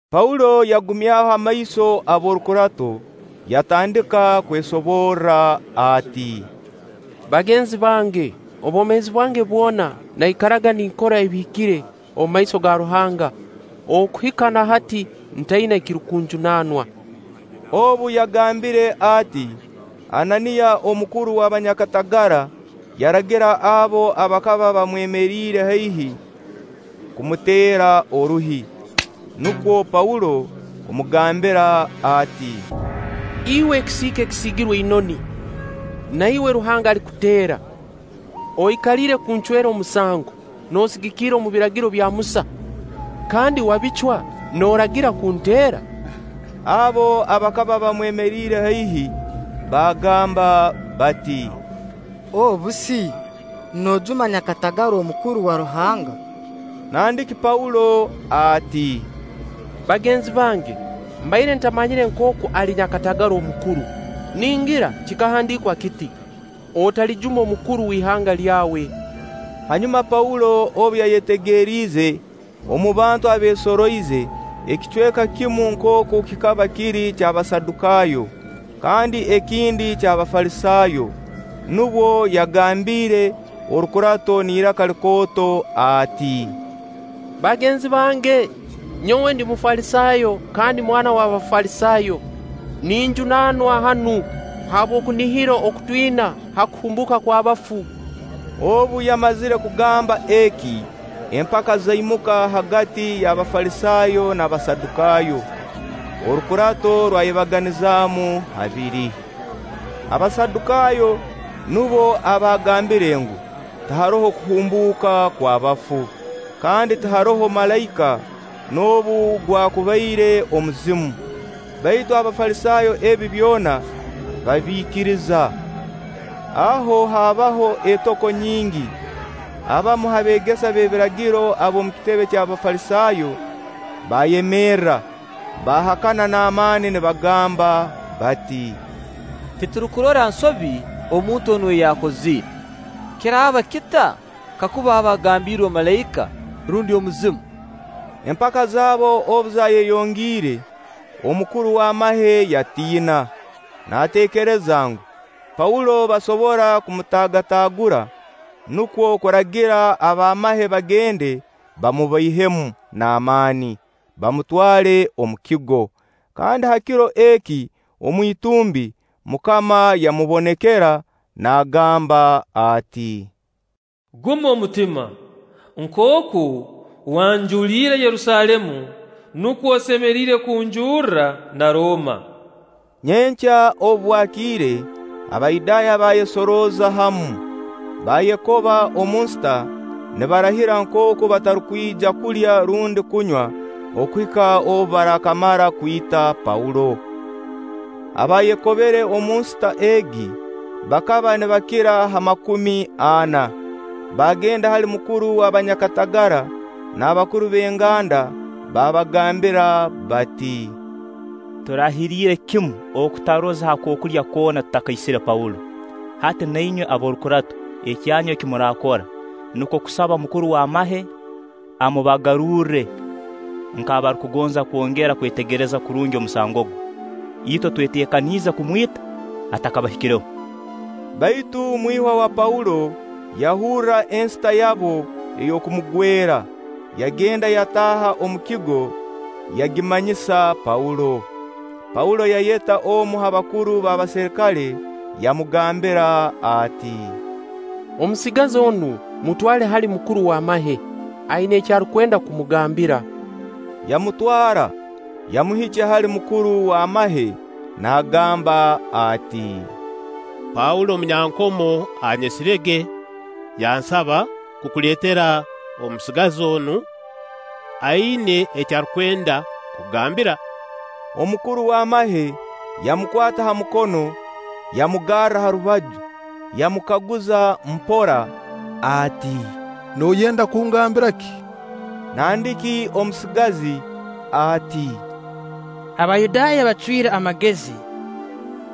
Paulo yagumyaho amaiso ab'orukurato, yatandika kwesoborra ati: “Bagenzi bange, obwomeezi bwange bwona naikaraga ninkora ebihikire omu maiso ga Ruhanga okuhika na hati, ntaina ekirukunjunanwa.” Obu yagambire ati, Ananiya omukuru w'abanyakatagara, yaragira abo abakaba bamwemeriire haihi kumuteera oruhi. Nukwo Paulo kumugambira ati: “Iwe ekisiika ekisiigirwe inoni! Na iwe Ruhanga alikuteera! Oikaliire kuncwera omusango noosigikira omu Biragiro bya Musa, kandi wabicwa nooragira kunteera?” Abo abakaba bamwemeriire haihi baagamba bati: “Obu si noojuma nyakatagara omukuru owa Ruhanga?” Nandiki Paulo ati: “Bagenzi bange, mbaire ntamanyire nkooku ali nyakatagara omukuru; ningira kikahandiikwa kiti: ‘Otalijuma omukuru w'ihanga lyawe.’” Hanyuma Paulo obu yayetegeriize omu bantu abeesoroize, ekicweka kimu nkooku kikaba kiri ky'Abasadukaayo kandi ekindi ky'Abafalisaayo, nubwo yagambiire Orukurato n'iraka likooto ati: “Bagenzi bange, nyowe ndi Mufalisaayo kandi mwana w'Abafalisaayo. Ninjunanwa hanu habw'okunihira oku twina ha kuhumbuuka kw'abafu.” Obu yamazire kugamba eki, empaka zaimuka hagati y'Abafalisaayo n'Abasadukaayo; orukurato rwayebaganizaamu habiri. Abasadukaayo nubo abaagambire ngu, tiharoho kuhumbuuka kw'abafu, kandi tiharoho malaika, noobu gwakubaire omuzimu; baitu Abafalisaayo ebi byona babiikiriza. Aho haabaho etoko nyingi, abamu ha beegesa b'ebiragiro ab'omu kitebe ky'Abafalisaayo baayemerra, baahakana n'amaani nibagamba bati: “Titurukurora nsobi omuntu onu ei yakozire. Kiraaba kita kakuba aba agambiirwe malaika rundi omuzimu?” Empaka zaabo obu zayeyongiire, omukuru w'amahe yatiina, naateekereza ngu, Paulo basobora kumutaagataagura, nukwo kuragira ab'amahe bagende bamubaihemu n'amaani, bamutwale omu kigo. Kandi ha kiro eki omu itumbi, MUKAMA yamubonekera naagamba ati: “Guma omutima, nkooku wanjuliire Yerusaalemu, nukwo osemeriire kunjurra na Rooma.” Nyenkya obu bwakiire, Abayudaaya baayesorooza hamu, baayekoba omu nsita nibarahira nkooku batarukwija kulya rundi kunywa okuhika obu barakamara kwita Paulo. Abaayekobere omu nsita egi, bakaba nibakira ha makumi ana. Baagenda hali bakuru b'abanyakatagara n'abakuru b'enganda baabagambira bati? “Turahiriire kimu okutaroza ha kookulya koona tutakaisire Paulo. Hati nu inywe n'ab'orukurato, ekyanyu eki muraakora nukwo kusaba mukuru w'amahe amubagarurre nk'abarukugonza kwongera kwetegereza kurungi omusango gwe. Itwe tweteekaniize kumwita atakabahikireho.” Baitu mwihwa wa Paulo yahurra ensita yabo ey'okumugwera; yagenda yataaha omu kigo, yagimanyisa Paulo. Paulo yayeta omu ha bakuru b'abaserikale, yamugambira ati: “Omusigazi onu mutwale hali mukuru w'amahe; aina eki arukwenda kumugambira.” Yamutwara, yamuhikya hali mukuru w'amahe nagamba ati: “Paulo omunyankomo anyesirege, yansaba kukuleetera omusigazi onu, aina eki arukwenda kukugambira.” Omukuru w'amahe yamukwata ha mukono, yamugarra ha rubaju, yamukaguza mpora ati: “Nooyenda kungambira ki?” Nandiki omusigazi ati: “Abayudaaya bacwire amagezi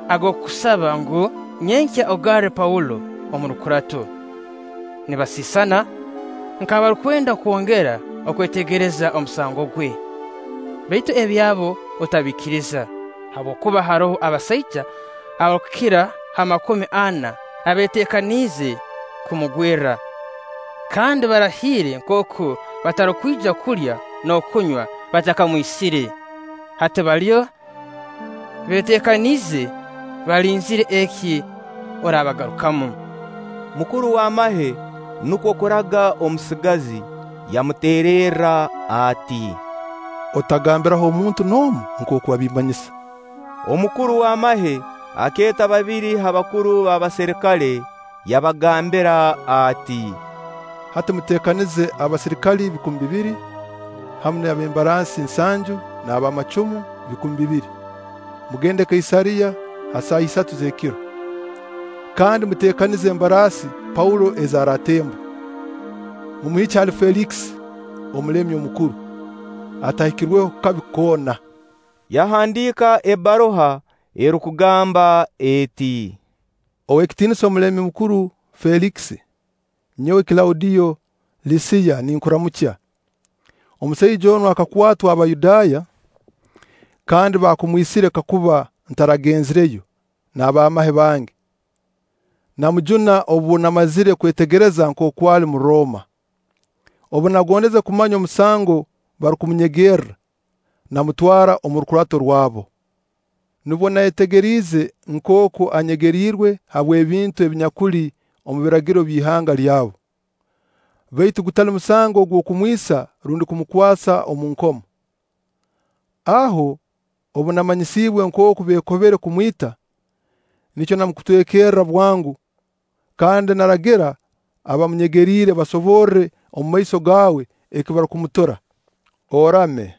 ag'okukusaba ngu, nyenkya ogarre Paulo omu rukurato, nibasisana nk'abarukwenda kwongera kwetegereza omusango gwe. Baitu ebyabo otabiikiriza, habwokuba haroho abasaija abarukukira ha makumi ana abeetekaniize kumugwerra, kandi barahiire nkooku batarukwija kulya n'okunywa batakamwisire. Hati baliyo beeteekaniize, balinzire eki oraabagarukamu.” Mukuru w'amahe nukwo kuraga omusigazi, yamuteererra ati: “Otagambiraho muntu n'omu nkooku wabimmanyisa.” Omukuru w'amahe akeeta babiri ha bakuru b'abaserikale yabagambira ati: “Hati muteekanize abaserikale bikumi bibiri, hamu n'ab'embaraasi nsanju n'ab'amacumu bikumi bibiri, mugende Kaisaariya ha saaha isatu z'ekiro. Kandi muteekanize embaraasi Paulo ezi aratemba, mumuhikye hali Feelikisi omulemi omukuru, atahikirweho kabi koona.” Yahandiika ebbaruha erukugamba eti: “Oweekitiinisa Omulemi Mukuru Feelikisi; nyowe Kilaudiyo Lisiya ninkuramukya. Omusaija onu akakwatwa Abayudaaya, kandi baakumwisire kakuba ntaragenzireyo n'ab'amahe bange, namujuna obu namazire kwetegereza nkooku ali Murooma. Obu nagondeze kumanya omusango barukumunyegerra, namutwara omu rukurato rwabo. Nubwo nayetegeriize nkooku anyegeriirwe habw'ebintu ebinyakuli omu biragiro by'ihanga lyabu, baitu gutali musango ogw'okumwisa rundi kumukwasa omu nkomo. Aho, obu namanyisiibwe nkooku beekobere kumwita, nikyo namukutwekerra bwango, kandi naragira abamunyegeriire basoborre omumaiso gaawe eki barukumutura. Orame!”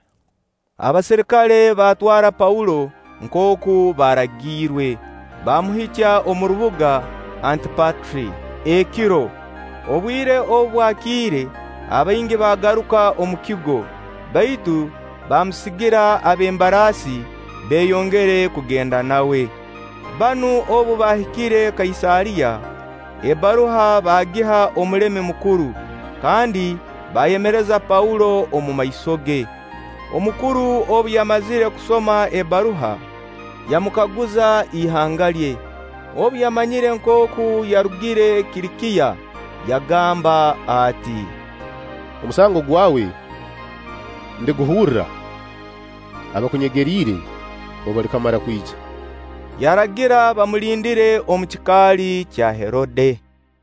Abaserikale baatwara Paulo nkooku baaragiirwe, baamuhikya omu rubuga Antipatri ekiro. Obwire obu bwakiire, abaingi baagaruka omu kigo, baitu baamusigira ab'embaraasi beeyongere kugenda nawe. Banu, obu baahikire Kaisaariya, ebbaruha bagiha omulemi omukuru, kandi baayemereza Paulo omu maiso ge. Omukuru obu yamazire kusoma ebbaruha, yamukaguza ihanga lye. Obu yamanyire nkooku yarugire Kilikiya, yagamba ati: “Omusango gwawe ndiguhurra abakunyegeriire obu balikamara kwija.” Yaragira bamulindire omu kikaali kya Herode.